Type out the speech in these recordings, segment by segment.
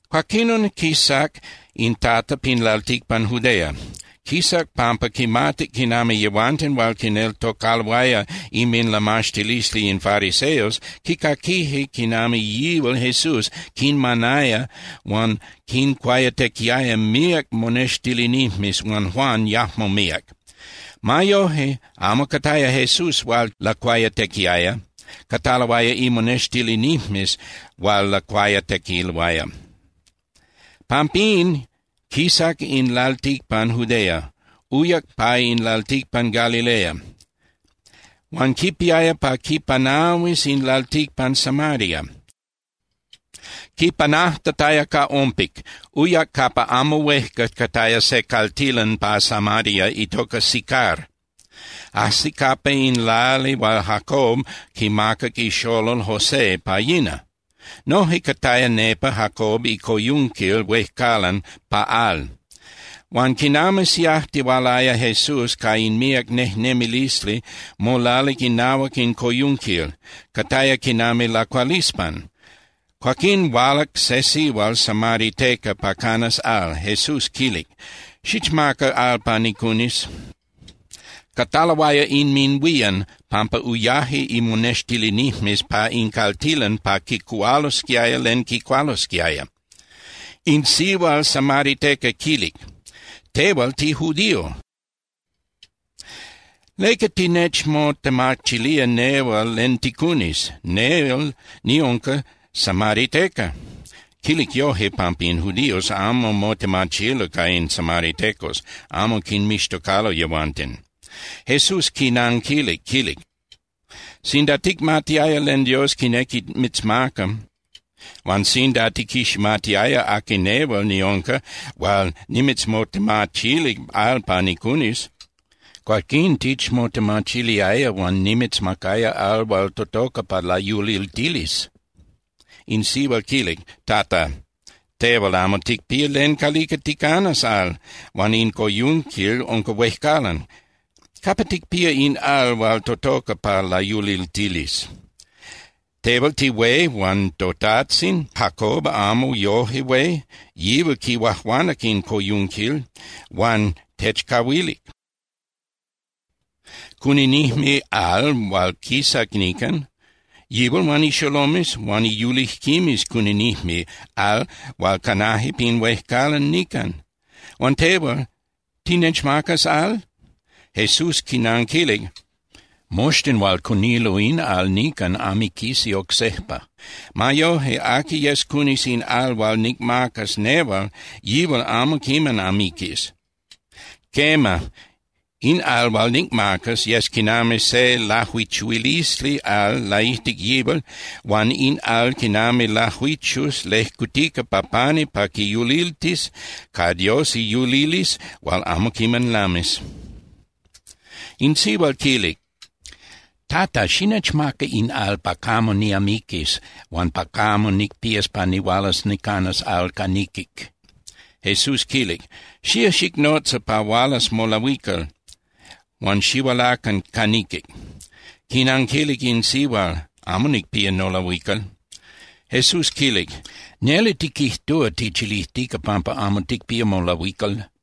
Cuaquinon, quisac in Tata pin lalticpan Judea. Quisac pampa quimatic quinami yehuanten hual quineltocaloaya inminlamaxtilisli in fariseos quicaquije quinami yihual Jesús quinmanaya huan quincuayatequiaya míac monextilinijmes huan Juan yajmo míac. Ma yoje, amo cataya Jesús hual lacuayatequiaya, cataloaya imonextilinijmes hual lacuayatequiloaya. Pampín, quisac in lalticpan Judea, uyac pa in lalticpan Galilea. Huan quipiaya pa quipanahuis in lalticpan Samaria. Quipanajtataya ca ompic, uyac capa amo huejca cataya se caltilan pa Samaria itocac Sicar. Ajsic capa in lali hual Jacob quimacac ixolol José pa yina. Noje cataya nepa Jacob icoyunquil huejcalan pa al. Huan quinami siajtihualaya Jesús ca in míac nejnemilisli, molalic inahuac in coyunquil, cataya quinami lacualispan. Cuaquín hualac se sihual samariteca pa canas al. Jesús quilic: —Xichmaca al pa nicunis. Cataloaya inminhuían pampa uyaje imonextilinijmes pa in caltilan pa quicuhualosquiaya len quicualosquiaya. In sihual samariteca quilic: —Tehual tijudío. ¿Leca tinechmotemachilía nehual len ticunis? Nel niunca samariteca. (Quilic yoje, pampa in judíos amo motemachilo ca in samaritecos, amo quinmixtocalo yehuanten.) Jesús quinanquilic, quilic: —Sinda ticmatiaya len Dios quinequi mitzmaca, huan sinda tiquiximatiaya aqui nehual niunca hual nimitzmotemachilic al pa nicunis, cuaquín tichmotemachiliaya huan nimitzmacaya al hual totoca pa layuliltilis. In sihual quilic: —Tata, tehual amo ticpía len calica ticanas al, huan in coyunquil unca huejcalan. ¿Capa ticpía in al hual totoca pa layuliltilis? ¿Tehual tihué huan totajtzin Jacob amo yoje hué? Yihual quihuajuanac in coyunquil huan techcahuilic. Cuninijme al hual quisac nican, yihual huan ixolomes huan iyulijquimes cuninijme al hual canaje pin huejcalan nican. Huan tehual, ¿tinechmacas al? Jesús quinanquilic: —Moxtin hual cunilo in al nican amiquisi oc sejpa. Ma yoje, aqui yes cunis in al hual nicmacas nehual, yihual amo quiman amiquis. Quema, in al hual nicmacas yes quinami se ilajuichuilisli al laijtic yihual huan in al quinami lajuichus lejcutica pa pani pa quiyuliltis ca Dios iyulilisli hual amo quiman lamis. In sihual quilic: —Tata, xinechmaca in al pa camo niamiquis huan pa camo nicpías pa nihualas nicanas al ca niquic. Jesús quilic: —Xía xicnotza pa hualas molahuical huan xihualacan ca niquic. Quinanquilic in sihual: —Amo nicpía nolahuical. Jesús quilic: —Neli tiquijtúa tichilijtica pampa amo ticpía molahuical.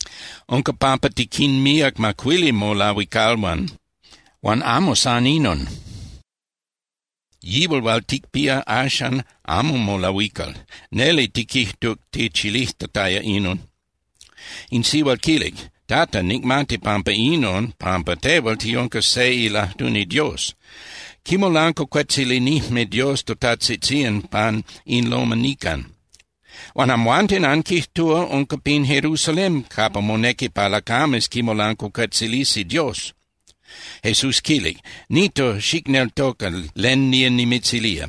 Unca pampa tiquinpíac macuili molahuicalhuan. Huan amo san inon, yihual hual ticpía axan amo molahuical. Neli tiquijtuc tichilijtataya inon. In sihual quilic: —Tata, nicmati pampa inon pampa tehual tiunca se ilajtuni Dios. Quimolancuacuetzilinijme Dios totajtzitzían pan in loma nican. Huan amhuanten anquijtúa unca pin Jerusalén capa monequi pa lacames quimolancuacuetzilisi Dios. Jesús quilic: —Nito, xicneltoca len nía nimitzilía.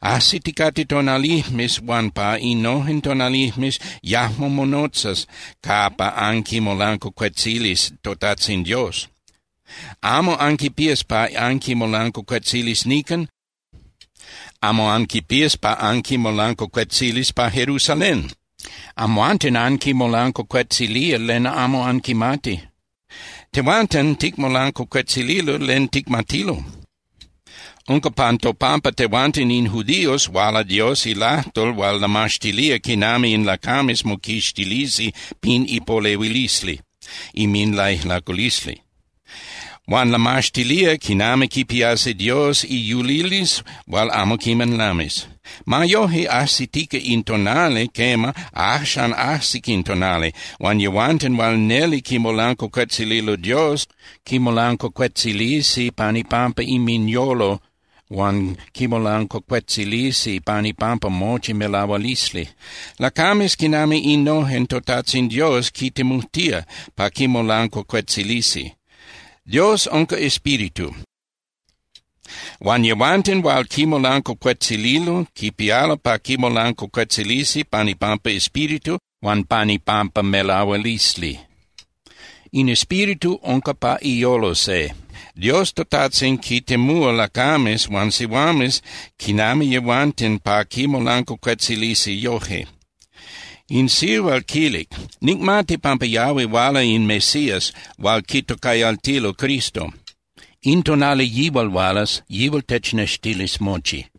Ajsiticate tonalijmes huan pa innojen tonalijmes yajmo monotzas capa anquimolancuacuetzilis toTajtzin Dios. Amo anquipías pa anquimolancuacuetzilis nican, amo anquipías pa anquimolancuacuetzilis pa Jerusalén. Amhuanten anquimolancuacuetzilía len amo anquimati. Tehuanten ticmolancuacuetzililo len ticmatilo. Unca pan topampa tehuanten in judíos huala Dios ilajtol hual lamaxtilía quinami in lacames moquixtilisi pin ipolehuilisli inminlaijlaculisli. Huan lamaxtilía quinami quipiasi Dios iyulilisli hual amo quiman lamis. Ma yoje, ajsitica in tonali, quema, axan ajsic in tonali, huan yehuanten hual neli quimolancuacuetzililo Dios quimolancuacuetzilisi pan ipampa inminyolo huan quimolancuacuetzilisi pan ipampa mochi melahualisli. Lacames quinami innojen toTajtzin Dios quintemujtía pa quimolancuacuetzilisi. Dios unca Espíritu, huan yehuanten hual quimolancuacuetzililo quipialo pa quimolancuacuetzilisi pan ipampa espíritu huan pan ipampa melahualisli. In espíritu unca pa iyolo se. Dios toTajtzin quintemúa lacames huan sihuames quinami yehuanten pa quimolancuacuetzilisi yoje. In sihual quilic: —Nicmati pampa yahui huala in Mesías hual quitocayaltilo Cristo. In tonali yihual hualas, yihual technextilis mochi.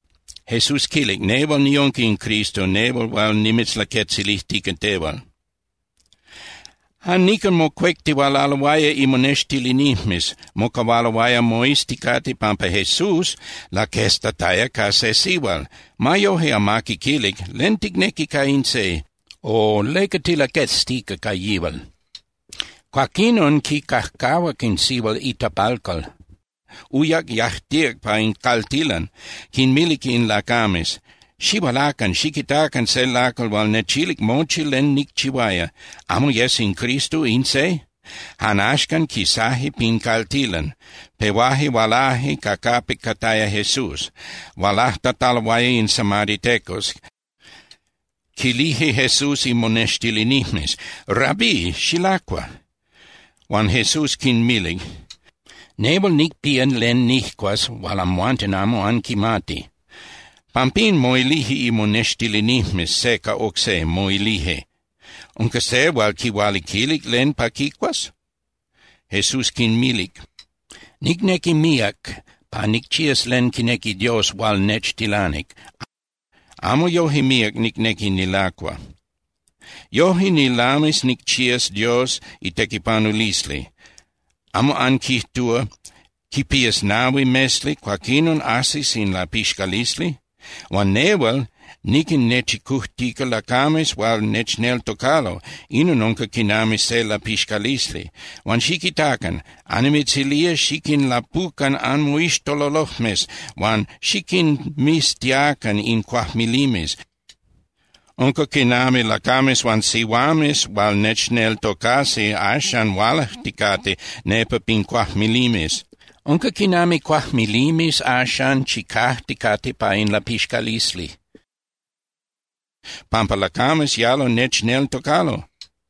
Jesús quilic: —Nehual niunca in Cristo, nehual hual nimitzlaquetzilijtica tehual. Jan nican mocuectihualaloaya imonextilinijmes, mocahualoaya moizticate pampa Jesús laqueztataya ca se sihual. Ma yojque amaqui quilic: “¿Len ticnequi ca in se?”, o “¿Leca tilaqueztica ca yihual?” Cuaquinon quicajcahuac in sihual itapalcal, uyac, yajtíac pa in caltilan, quinmilic in lacames: —Xihualacan xiquitacan se lacal hual nechilic mochi len nicchihuaya. ¿Amo yes in Cristo in se? Jan axcan quisaje pin caltilan, pehuaje hualaje ca capic cataya Jesús. Hualajtataloaya in samaritecos, quilije Jesús imonextilinijmes: —Rabí, xilacua. Huan Jesús quinmilic: —Nehual nicpía len nijcuas hual amhuanten amo anquimati. Pampín moilije imonextilinijmes se ca oc se, moilije: —¿Unca se hual quihualiquilic len pa quicuas? Jesús quinmilic: —Nicnequi míac pa nicchías len quinequi Dios hual nechtilanic, amo yoje míac nicnequi nilacua. Yoje nilamis nicchías Dios itequipanulisli. ¿Amo anquijtúa: “Quipías nahui mesli, cuaquinon ajsis in lapixcalisli”? Huan nehual niquinnechicujtica lacames hual nechneltocalo, inon unca quinami se lapixcalisli. Huan xiquitacan, annimitzilía xiquinlapucan anmoixtololojmes huan xiquinmiztiacan in cuajmilimes. Unca quinami lacames huan sihuames hual nechneltocasi axan hualajticate nepa pin cuajmilimes. Unca quinami cuajmilimes axan chicajticate pa in lapixcalisli, pampa lacames yalo nechneltocalo.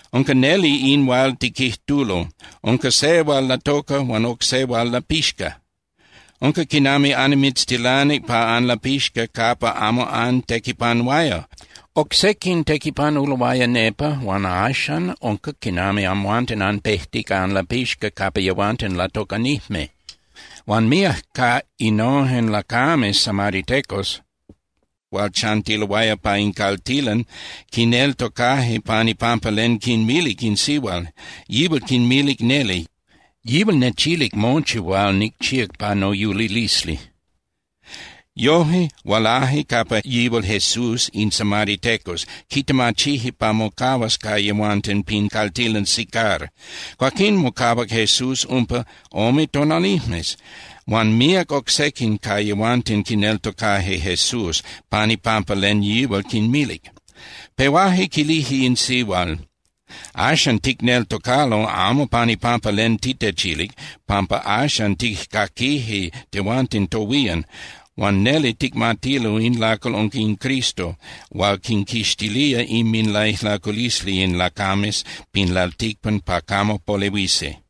Unca neli in hual tiquijtulo: “Unca se hual latoca, huan oc se hual lapixca.” Unca quinami annimitztilanic pa anlapixca capa amo antequipanuaya. Oc sequin tequipanuloaya nepa, huan axan unca quinami amhuanten anpejtica anlapixca capa yehuanten latocanijme. Huan míac ca innojen lacames samaritecos hual chantiloaya pa in caltilan quineltocaje pan ipampa len quinmilic in sihual. Yihual quinmilic neli: “Yihual nechilic mochi hual nicchíac pa noyulilisli.” Yoje, hualaje capa yihual Jesús in samaritecos, quitemachije pa mocahuas ca yehuanten pin caltilan Sicar. Cuaquín mocahuac Jesús umpa ome tonalijmes. Huan míac oc sequin ca yehuanten quineltocaje Jesús pan ipampa len yihual quinmilic. Pehuaje quilije in sihual: —Axan ticneltocalo amo pan ipampa len titechilic, pampa axan tijcaquije tehuanten tohuían, huan neli ticmatilo in lacal unca in Cristo hual quinquixtilía inminlaijlaculisli in lacames pin lalticpan pa camo polehuisi.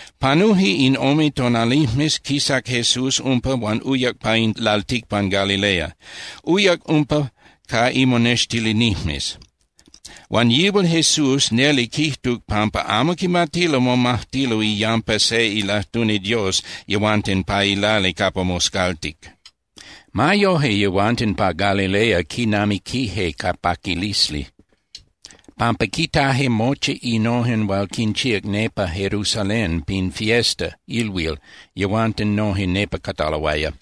Panuje in ome tonalijmes, quisac Jesús umpa huan uyac pa in lalticpan Galilea. Uyac umpa ca imonextilinijmes. Huan yihual Jesús neli quijtuc pampa amo quimatilo momajtilo iyampa se ilajtuni Dios yehuanten pa ilali capa moscaltic. Ma yoje, yehuanten pa Galilea quinamiquije ca paquilisli, pampa quitaje mochi innojen hual quinchíac nepa Jerusalén pin fiesta (ilhuil), yehuanten noje nepa cataloaya.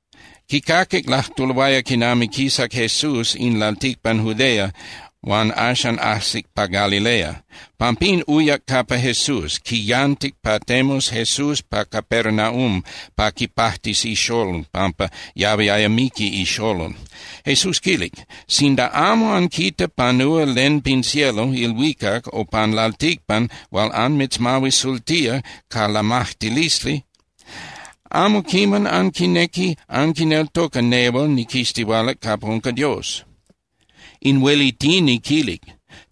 Quicaquic lajtuloaya quinami quisac Jesús in lalticpan Judea huan axan ajsic pa Galilea. Pampín uyac capa Jesús, quiyantic pa temus Jesús pa Capernaum pa quipajtis ixolol, pampa yahuiaya miqui ixolol. Jesús quilic: —Sinda amo anquita panúa len pin cielo (ilhuicac) o pan lalticpan hual anmitzmahuisultía ca lamajtilisli, amo quiman anquinequi anquineltoca nehual niquistihualac capa unca Dios. In huelitini quilic: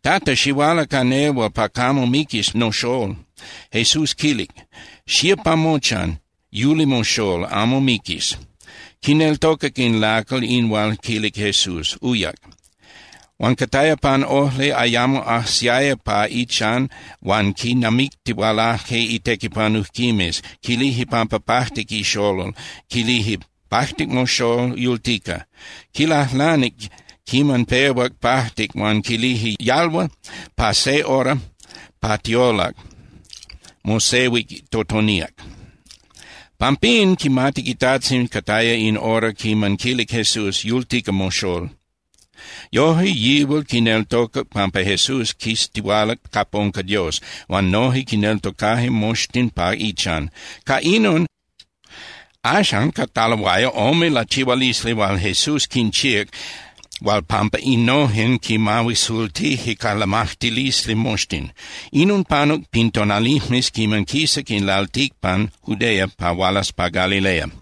—Tata, xihuala ca nehual pa camo miquis noxól. Jesús quilic: —Xía pa mochan, yuli moxól, amo miquis. Quineltocac in lacal in hual quilic Jesús, uyac. Huan cataya pan ojli, ayamo ajsiaya pa ichan huan quinamictihualaje itequipanujquimes, quilije pampa pajtic ixolol, quilije: —Pajtic moxól, yultica. Quilajlanic quiman pehuac pajtic huan quilije: —Yalhua pa se hora pa tiolac mosehuic totoníac. Pampín quimatic itajtzin cataya in hora quiman quilic Jesús: “Yultica moxól.” Yoje yihual quineltocac pampa Jesús quistihualac capa unca Dios huan noje quineltocaje moxtin pa ichan. Ca inon, axan cataloaya ome lachihualisli hual Jesús quinchíac hual pampa innojen quinmahuisultije ca lamajtilisli moxtin. Inon panuc pin tonalijmes quiman quisac in lalticpan Judea pa hualas pa Galilea.